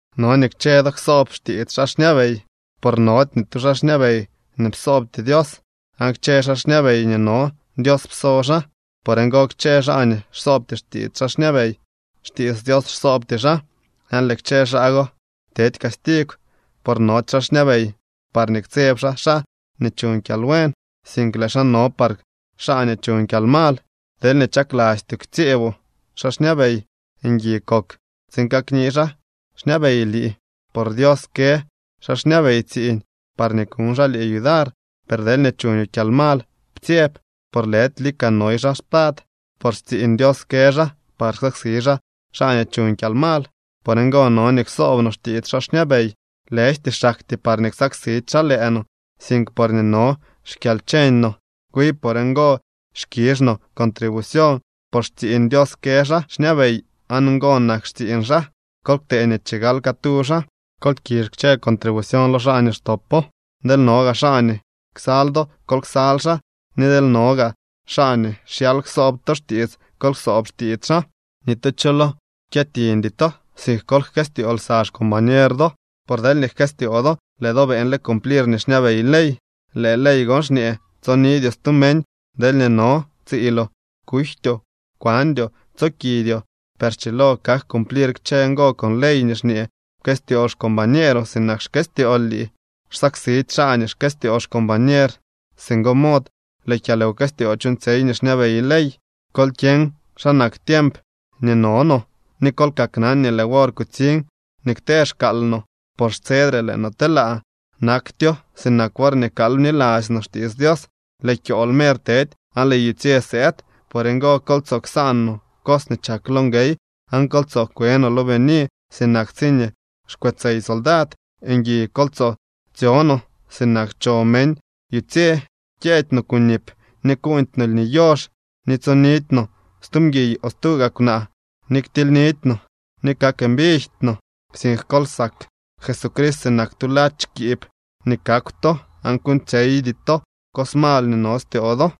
No nii kchë do ksoob xtiits xaa xñabey. Por nody ni tu xaa xñabey nii psoobty Dios, aan kchë xaa xñabey nii no, Dios pso xaa. Por ngo kchë xaa nii xsoobty xtiits xaa xñabey, xtiits Dios xsoobty xaa. Aan lëë kchë xaa go tedy castigw. Por nody xaa xñabey parñee ktseb xaa xaa nii chuñ kyalbuen, sink lëë xaa no par xaa nii chuñ kyalmal. Deelñee chaklastyoo ktsyeeboo xaa xñabey, ngui kok tsiin kakni xaa xñabey lii. Por Dios kë xaa xñabey tsiiñ parñee kuñ xaa lii yudar. Per deelñee chuñoo kyalmal, ptsyeb. Por lëdy lika noy xaa spad, por xtsiiñ Dios kë xaa par ksaksi xaa xaa nii chuñ kyalmal. Por ngo no nii ksoob no xtiits xaa xñabey, lëjty xaktyee parñee ksaksidy xaa lëë no, sink porñee no xkyalcheñ no. Wi por ngo xkizh to contribucioñ, por xtsiiñ Dios kë xaa xñabey aan ngo nak xtsiiñ xaa. Kol ktee nii chigal catu xaa. Kol kizh kchë contribucioñ lo xaa nii xtopo. Deel no gaa xaa nii ksal do, kol ksal xaa, ni deel no gaa xaa nii xyal ksoob to xtiits, kol ksoob xtiits xaa. Ni tu cho lo kyëtiñdy to, sink kol jkëstyoo lsa xcombañer do. Por deelñee jkëstyoo do, lëë do beeñle cumplir nii xñabey ley. Lëë ley gon xñee: “Tsonidyoo stu meñ deelñee no tsiiloo, kujtyoo, kwandyoo, tsookidyoo.” Per schilo kak cumplir kchë ngo con ley nii xñee: “Pkëstyoo xcombañeeroo sinak xkëstyool lii.” Xsaksidy xaa nii xkëstyoo xcombañer. Singo mod lëë kyalwkëstyoo chuuñtsyey nii xñabey ley. Kol kyeñ xa nak tiemp nii no no, ni kol kaknan nii lëë wor kutsiñ nii kte xkaal no. Por xtsedre lëë no telaa. Naktyo sinak worñee kal bniladzy no xtiits Dios. Lëë kyool mer tedy aan lëë yutsye sëëd. Por ngo kol tsoo ksaan no cos nii chak lo nguey, aan kol tsoo kwe no lo bini sinak tsiñee xkwetsey soldad. Ngui kol tso tsyo no sinak cho meñ yutsye. Kyëëdy no kunip ni kuuñdy no lni yox, ni tsyonidy no stu mguiy o stu gaa kwnaa, ni ktildy no ni kak mbijty no. Sink kol sak Jesucrist sinak tu ladx kiib nii kakw to, aan kuuñtsyeydy to cos mal nii no styoo do.